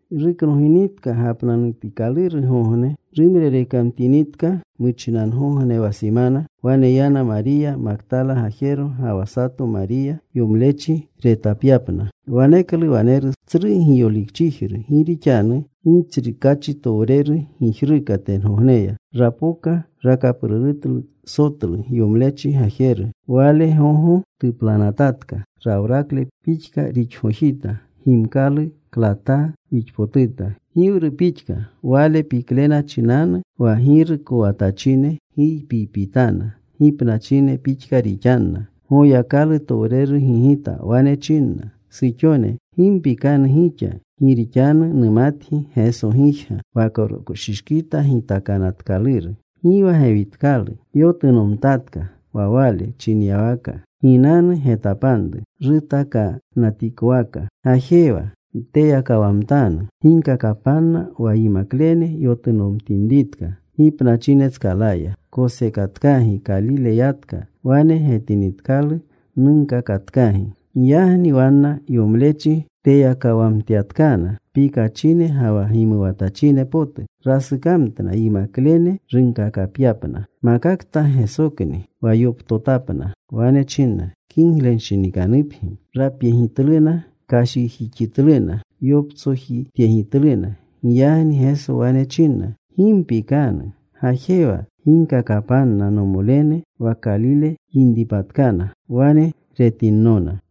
Ruknoginitka gapnanutikalurgogne, rumrerekamtinitka muchinangogne wa simana, wane yana Mariya Maktala gajero ga wa sato Mariya, yomlechi retapyapna. Waneklu waneru tsru giyolikchijru. Gi rixanu Gitsrukaachitowreru gijruka tengogneya. Rapoka. Rakaprurutlu sotlu yomlechi gajeru. Wale gogo tuplanatatka. Rawrakle pixka rixgojita. Gimkalu klataa rixpotuta giwru pixka. Wale piklena chinanu wa girukowatachine giypiypitana. Gipnachine pixka rixanna. Goyakalutowreru gigita. Wane chinna suxone, “Gi mpikanu gixa. Gi rixanu numatgi Geso gijga, wa koroshishkita gitakanatkaluru. Gi wa gewitkalu. Yotunomtatka wa Wale chinyawaka. Ginanu. Getapanru rutakanatikowaka. Gajewa. Nteyakawamtanu. Ginkakapanna wa yimaklene yotunomtinritka gipnachinetskalaya. Kosekatkagi. Kalile yatka. Wane getinitkalu. Nunkakatkagi.” Giyagni wanna yomlechi teyakawamtyatkana. Pikachine ga wa gimuwatachine potu. Rasukamtna yimaklene runkakapyapna. Makakta Gesokni wa yoptotapna. Wane chinna, “Kiglenshinikanupgi.” Rapyegitluna. Kashjixitluna. Yoptsojityegitluna. Giyagni Geso wane chinna, “Gi mpikanu. Gajewa. Ginkakapanna nomolene wa Kalile yinripatkana. Wane retinnona.”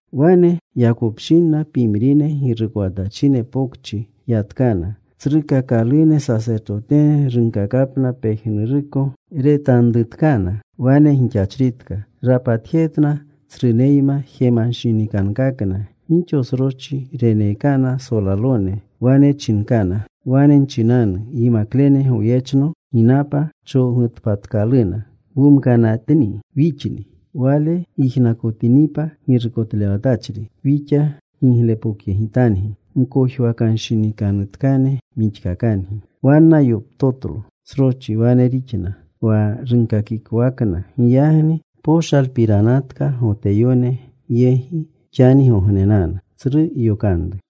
Wane yakopshinna, pimrine girukowatachine pokchi yatkana. Tsrukakalune sasertotene runkakapna pejnuruko retanrutkana wane gixachritka. Rapatjetna tsruneyma. Jemanshinikankakna. Gixo sroschi reneekana solalone. Wane chinkana, “Wane nchinanu, ‘Yimaklene goyechno ginapa. Chowgutpatkaluna, wumkanatni wixni.’ Wale yijnakotinipa girukotlewatachri, wixa giglepokyegitangi. Mkojwakanshinikanutkane wixkakangi.” Wanna yoptotlo sroschi. Wane rixna wa runkakikowakna. Giyagni poshalpiranatka Goteyone yegi xanigognenanu.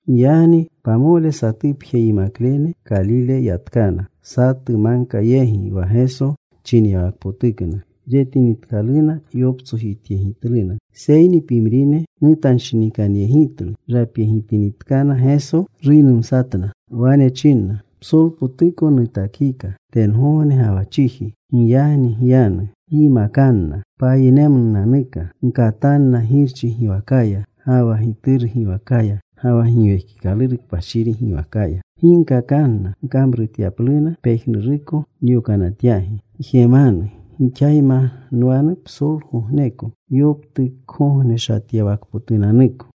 Giyagni pamole satupje yimaklene Kalile yatkana, satu magka yegi wa Geso chinyawakpotukna. Retinitkaluna yoptsojityegitluna. Seyni pimrine nutanshinikanyegitlu. Rapyegitinitkana Geso, ruynumsatna. Wane chinna, “Psolpotuko nutakika tengogne ga wa chiji. Giyagni gyanu. Gyimakanna payinemnunanuka. Gkatanna Girchi giwakaya, ga wa Gituru giwakaya, ga wa Giwekikaluru Kpashiri giwakaya. Ginkakanna kamrutyapluna pejnuruko nyokanatyagi. Gjemanu: Gixayma nwanu psolgogneko yoptukgogneshatyawakpotunanuko.”